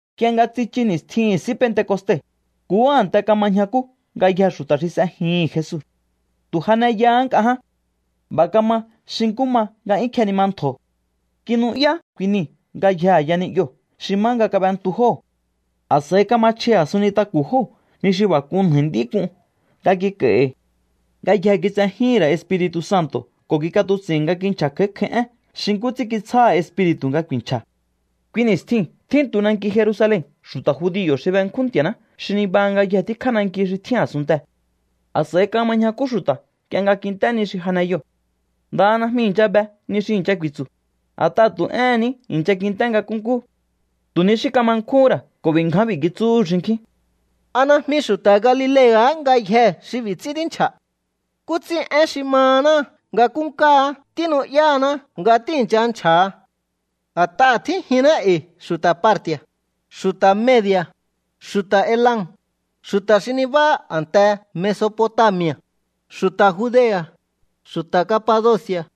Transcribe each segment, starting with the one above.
Nk'ie nga tsichu ni̱stjihi̱n S'í Pentecoste, nkuhú a̱nte kama ñjakú ngayjee̱ xu̱ta̱ xi s'ejihi̱n Jesu. Tu̱ janeyahá nk'a ján. B'a̱ kama xi nkú ma nga 'yún kjenima ntjo̱. Kinu'yá kui nii̱ ngayjee̱ a̱ya ni'yoo̱ xi má nga kab'entu jóo̱. A̱s'a̱i kama chji a̱sun nintaku̱ jóo̱ ni xi b'a̱ k'un nja̱i̱ nd'í k'un nga kik'a̱i̱hi̱. Ngayjee̱ kitsejíhi̱n ra̱ Espiri̱tu̱ Santo̱ ko̱ kik'atuts'i̱hi̱n nga kinchja̱ kj'a̱í kj'a̱í én xi nkú ts'ín kitsjáha̱ Espiri̱tu̱ nga ku̱i̱nchja̱. Kui ni̱stjiu̱n tjíntu nanki Jerusalen xu̱ta̱ judio̱ xi benkjún Nti̱a̱ná xi nibaha ngayje tíkjá nanki xi tjín a̱sunntee̱. A̱s'a̱i kama ñjakú xu̱ta̱ nk'ie nga kint'é ni xi janeyoo̱. Ndaha najmi i̱ncha be ni xi i̱ncha ku̱i̱tsu̱, a̱t'aha̱ tu̱ éhe̱n ní i̱ncha kint'é nga nkúnkú. Tu̱ ni xí kama nkjúhu̱n ra̱ ko̱ b'i̱ ngján b'i̱ kitsúhu̱ xinkjín: —¿A najmi xu̱ta̱ Galilea̱há ngayjee̱ xi b'i̱ ts'ín tínchja̱? ¿Nkú ts'ín én xi mahaná nga nkúnkáá tínu'yáhaná nga tíi̱ncha nchja̱ha? A̱t'aha̱ tjínjinná e̱i̱ xu̱ta̱ Parti̱a̱, xu̱ta̱ Medi̱a̱, xu̱ta̱ Elam, xu̱ta̱ xi nibáha a̱nte Mesopotami̱a̱, xu̱ta̱ Judea̱, xu̱ta̱ Capadoci̱a̱,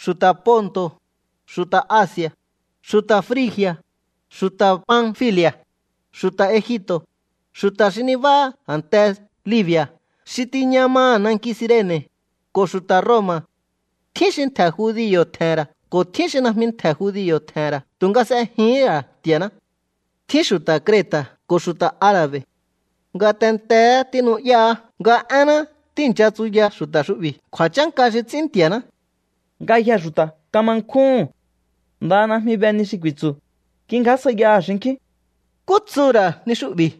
xu̱ta̱ Ponto̱, xu̱ta̱ Asi̱a̱, xu̱ta̱ Frigi̱a̱, xu̱ta̱ Panfili̱a̱, xu̱ta̱ Egipto̱, xu̱ta̱ xi nibáha a̱nte Libi̱a̱ xi tiña maha̱ nanki Cirene̱, ko̱ xu̱ta̱ Roma̱. Tjín xi ntje̱ judio̱ tje̱he̱n ra̱ ko̱ tjín xi najmi ntje̱ judio̱ tje̱he̱n ra̱ tu̱nga s'ejihín ra̱ Nti̱a̱ná. Tjín xu̱ta̱ Creta̱ ko̱ xu̱ta̱ Ara̱be̱. Ngatenteé tínu'yáá nga énná tíi̱ncha tsuyaha̱ xu̱ta̱ xu'bi̱ kju̱a̱chánka xi ts'ín Nti̱a̱ná. Ngayjee̱ xu̱ta̱ kama nkjúhu̱n. Ndaha najmi be ni xi ku̱i̱tsu̱. Kingjásjaiyaha̱ xinkjín: —¿Nkú tsuhu̱ ra̱ ni xu'bi̱?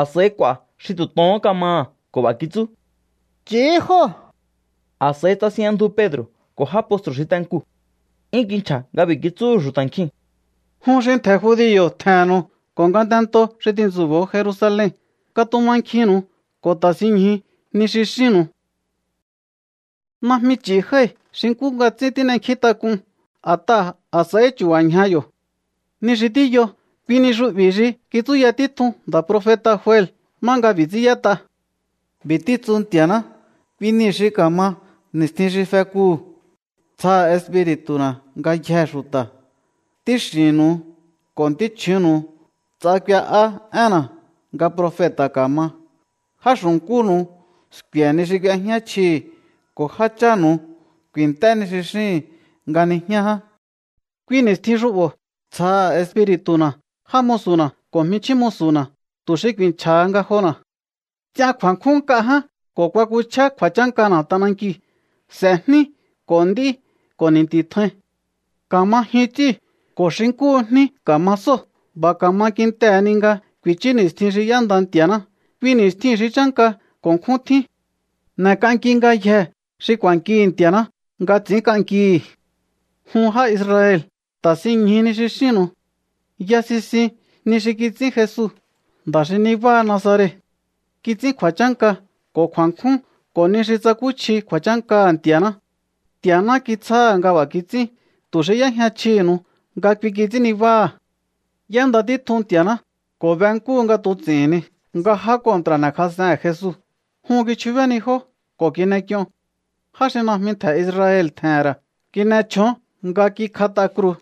A̱s'a̱i k'u̱a̱ xi tu̱ tohón kamaha̱ ko̱ b'a̱ kitsú: —Ch'i̱hí jóo̱. A̱s'a̱i tsasinjña ndju Pedro̱ ko̱ já postru̱ xi te nkuu̱. 'Yún kinchja̱ nga b'i̱ kitsúhu̱ xu̱ta̱ nkjiu̱n: —Jun xi ntje̱ judio̱ tje̱he̱nnu̱u ko̱ ngatentoo̱ xi tintsu̱bo̱o Jerusalen, katumankjinnu̱u ko̱ ta̱sinñju ni xi xínnu̱u. Najmi ch'i̱ jái̱ xi nkú nga ts'ín tín'enkjíntak'un, a̱t'aha̱ a̱s'a̱ihí chu̱ba̱ ñja yo̱. Ni xi tíyo, kui ni xu'bi̱ xi kitsúya títjun nda̱ profeta̱ Joel má nga b'i̱ ts'ín y'ét'a: B'i̱ títsu Nti̱a̱ná: Kui nii̱ xi ka̱ma ni̱stjin xi fekuu̱, tsjaha̱ Espiri̱tu̱na̱ ngayjee̱ xu̱ta̱. Ntíx'i̱nnu̱u ko̱ ntíchju̱únnu̱u ts'a k'ue'á énna̱ nga profeta̱ ka̱ma. Já xu̱nkúnu̱u sku̱e̱ ni xi k'uejñá chjihi̱, ko̱ jáchánu̱u ku̱i̱nt'é ni xi xíhi̱n nga nijñá ján. Kui ni̱stjin xu'bo̱ tsjaha̱ Espiri̱tu̱na̱ já musu̱na̱ ko̱ jminchjín musu̱na̱, tu̱ xi ku̱i̱nchja̱ha ngajona̱. Ts'ian kju̱a̱nkjún nk'a ján, ko̱ kuakuchjá kju̱a̱chánkana̱ t'anankiu̱. S'e̱ jní ko̱ nd'í ko̱ ni̱nti̱ tjain. Ka̱ma jyun ts'íu̱ ko̱ xi nkúhu jní ka̱ma sóo̱. B'a̱ ka̱ma kintehe̱ ni nga ku̱i̱chú ni̱stjin xi y'énda Nti̱a̱ná, kui ni̱stjiu̱n xi chánka ko̱ nkjún tjín. N'e̱k'anki ngayjee̱ xi k'u̱a̱nkihi̱ Nti̱a̱ná nga ts'i̱ínnkihi̱. ’Jun já Israel, ta̱sinñju ni xi xínnu̱u. Ya sisiun ni xi kits'ín Jesu, nda̱ xi nibáha Nazaret. Kits'ín kju̱a̱chánka ko̱ kju̱a̱nkjún ko̱ ni xi tsakúchji kju̱a̱chánkaha̱ Nti̱a̱ná. Nti̱a̱ná kitsjáha̱ nga b'a̱ kits'ín tu̱ xi y'éjña chjihi̱nu̱u nga kui kits'ín nibáha̱. Y'énda títjun Nti̱a̱ná ko̱ be nkúhu nga tuts'ihi̱n ni nga já kontra̱ n'e̱kjas'ehe̱n Jesu. Jun kichjubénijó ko̱ kin'ek'ion. Já xi najmi ntje̱ Israel tje̱he̱n ra̱ kin'e chjón nga kikjat'a kruu̱.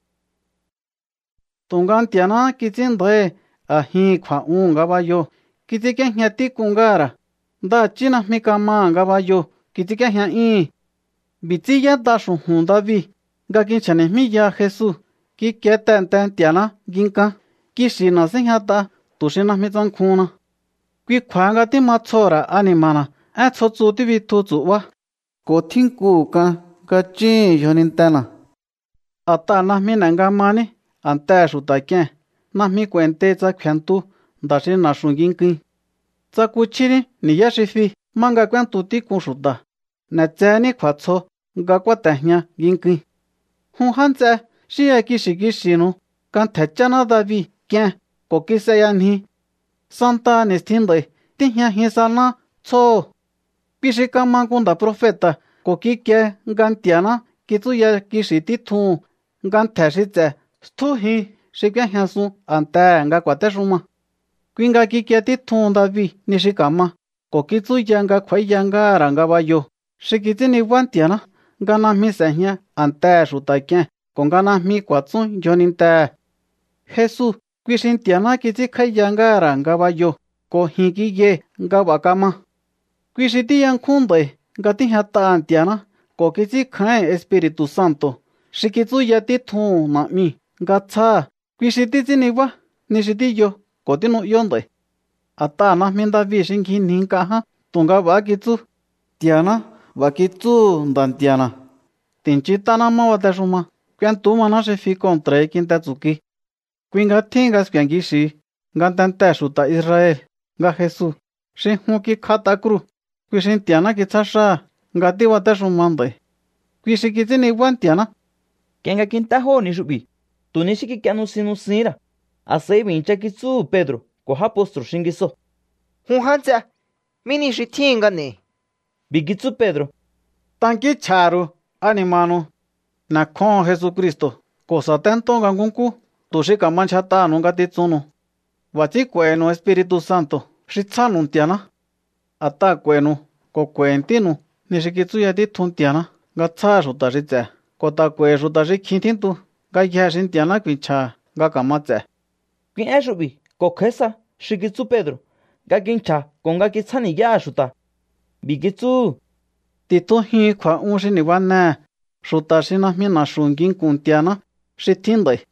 Tu̱nga Nti̱a̱náhá kits'ín nda̱íhi̱ a̱jihi̱n kju̱a̱'uhu̱n ngabayoo̱. Kits'ínk'íéjña tík'un ngáha̱ ra̱. Ndaha̱chí najmi kamaha̱ ngabayoo̱ kits'ínk'íéjña'yúhu̱n. ’B'i̱ ts'ín yét'a xu̱ju̱n David nga kinchja̱ni̱jmíyaha Jesu: Kikie tehe̱nte Nti̱a̱ná nginkán, kixi̱na̱ síjñat'a tu̱ xi najmi tsankjuhunna. Kui kju̱a̱ha nga tíma tsjoho̱ ra̱ ani̱ma̱na̱, én tsjo tsu tíbitju tsu̱'bá, ko̱ tjínkuhu̱ k'an nga chúhu̱n yjonintena̱. A̱t'aha̱ najmi n'e̱ nga maní a̱ntehe̱ xu̱ta̱ k'ie̱n, najmi k'u̱a̱i̱ntei tsa kfe̱ntu nda̱ xi na̱xu̱ nginkuin. Tsakuchjíní ni̱yá xi fi má nga k'úéntu tík'un xu̱ta̱, n'e̱tsehení kju̱a̱tsjo nga kúáte̱jña nginkuin. ’Jun já nts'e, xínya kixi̱ kixi̱nu̱u nga ntje̱ cháná David k'ien ko̱ kis'eyanji. Santaha ni̱stjin nd'a̱i̱ tíjñajin saná tsjóho̱. Kui xi kama nku nda̱ profeta̱ ko̱ kikie nga Nti̱a̱ná kitsúya kixi̱ títjuhu̱n nga ntje̱ xi ts'e̱ stjújin xi k'úéjñasun a̱ntehe̱ nga ku̱a̱téxuma. Kui nga kikie títjuhun David ni xi ka̱ma ko̱ kitsúya nga kj'u̱a̱íya ngáha̱ ra̱ ngabayoo̱ xi kits'ín nibá Nti̱a̱ná, nga najmi s'e̱jña a̱ntehe̱ xu̱ta̱ k'ie̱n ko̱ nga najmi ku̱a̱tsún yjonintehe̱. ’Jesu, kui xi Nti̱a̱ná kits'ínkj'áíya ngáha̱ ra̱ ngabayoo̱ ko̱ ji̱n kiyai̱ nga b'a̱ kama. Kui xi tíyankjún nd'a̱i̱ nga tíjñat'a Nti̱a̱ná ko̱ kits'ínkjáíhi̱n Espiri̱tu̱ Santo̱ xi kitsúya títjuhu̱n Na̱'miu̱ nga tsjáha̱. Kui xi títs'ín nibá ni xi tíyo ko̱ tínu'yó nd'a̱i̱. A̱t'aha̱ najmi David xi ngjinji nk'a ján, tu̱nga b'a̱há kitsú: Nti̱a̱ná b'a̱ kitsúhu̱ Nda̱ Nti̱a̱na̱: “Ti̱nchint'aná má batexuma, k'uentú maná xi fi kontra̱hi kinte tsu̱kui.” ’Kui nga tjíhin nga sku̱e̱ kixi̱hi ngatentee̱ xu̱ta̱ Israel nga Jesu, xi jun kikjat'a kruu̱, kui xi Nti̱a̱ná kitsjá xáha̱ nga tíbatéxuma nd'a̱i̱. Kui xi kits'ín nibá Nti̱a̱ná. Nk'ie nga kint'é jóo̱ ni xu'bi̱, tu̱ ni xí kik'ie nusin nusihín ra̱. A̱s'a̱i b'i̱ i̱ncha kitsúhu̱ Pedro̱ ko̱ já postru̱ xingisoo̱: —Jun já nts'e, ¿mí ni xi tjíhin nga n'e̱i̱? B'i̱ kitsú Pedro̱: —Tankínchj'a̱ha̱ ru̱u ani̱ma̱nu̱u. N'e̱kjóho̱on Jesucristo̱ ko̱ sa̱téntó nga nkúnkú tu̱ xi ka̱ma ndyjat'aha̱nu̱u ngatitsunnu̱u. B'a̱ ts'ín k'u̱a̱i̱hi̱nu̱u Espiri̱tu̱ Santo̱ xi tsjánu̱u Nti̱a̱ná. A̱t'aha̱ k'u̱a̱i̱nu̱u ko̱ ku̱a̱i̱hi̱ ntínu̱u ni xi kitsúya títjun Nti̱a̱ná nga tsjáha̱ xu̱ta̱ xi ts'e̱, ko̱ ta̱ k'u̱a̱i̱hi̱ xu̱ta̱ xi kjin tjíntu, ngayjee̱ xi Nti̱a̱ná ku̱i̱nchja̱ha̱ nga ka̱ma ts'e̱. Kui én xu'bi̱ ko̱ kj'a̱í sa xi kitsú Pedro̱ nga kinchja̱ ko̱ nga kitsjáni̱yáha̱ xu̱ta̱. B'i̱ kitsúhu̱: —Ti̱tjujihu̱un kju̱a̱'un xi ni̱banehe̱ xu̱ta̱ xi najmi na̱xu̱ nginku̱n Nti̱a̱ná xi tjín nd'a̱i̱.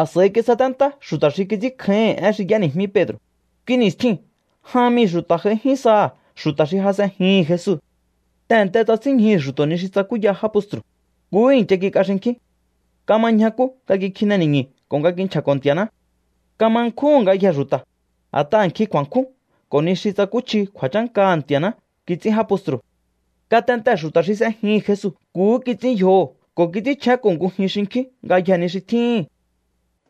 A̱s'a̱i kisaténtá xu̱ta̱ xi kits'ínkjáíhi̱n én xi y'éni̱jmí Pedro̱. Kui ni̱stjiu̱n jan mii̱ xu̱ta̱ j'aijín saha̱ xu̱ta̱ xi ja s'ejihi̱n Jesu. Tehe̱nte tsasínñjuhu̱ xu̱to̱ ni xi tsakúya já postru̱. Nkuhú i̱ncha kik'a xinkjín. Kama ñjakú nga kikjine ni̱ñu̱ ko̱ nga kinchja̱ko̱ Nti̱a̱ná. Kama nkjúhu̱n ngayjee̱ xu̱ta̱, a̱t'aha̱ nkjin kju̱a̱nkjún ko̱ ni xi tsakúchji kju̱a̱chánkaha̱ Nti̱a̱ná kits'ín já postru̱. Ngatentee̱ xu̱ta̱ xi s'ejihi̱n Jesu nkuhú kits'ín yjoho̱ ko̱ kits'ínchjénko̱ ngujin xinkjín ngayjee̱ ni xi tjíhi̱n.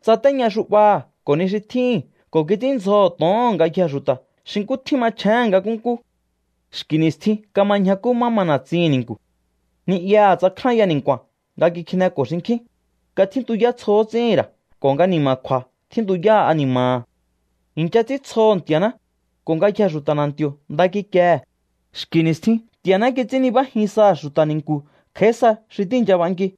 Tsatéña xu'baha̱ ko̱ ni xi tjíhi̱n ko̱ kits'ínndzjoho̱ to̱oho̱n ngayjee̱ xu̱ta̱ xi nkú tjín machjéhe̱n nga nkúnkú. Xki̱ ni̱stjin kama ñjakú má ma na̱tsihi̱n ni̱nku̱. Ni'yaha̱ tsakjánya ni̱nku̱a̱n nga kikjineko̱ xinkjín, nga tjíntuyá tsjo ts'íhi̱n ra̱ ko̱ nga ni̱ma̱kju̱a̱ tjíntuyá ani̱ma̱ha̱. I̱ncha ts'íntsjoho̱ Nti̱a̱ná, ko̱ ngayjee̱ xu̱ta̱ na̱nti̱o̱ nda kikiehe̱. Xki̱ ni̱stjin Nti̱a̱ná kits'ín nibájin saha̱ xu̱ta̱ ni̱nku̱ kj'a̱í sa xi tíi̱ncha b'anki.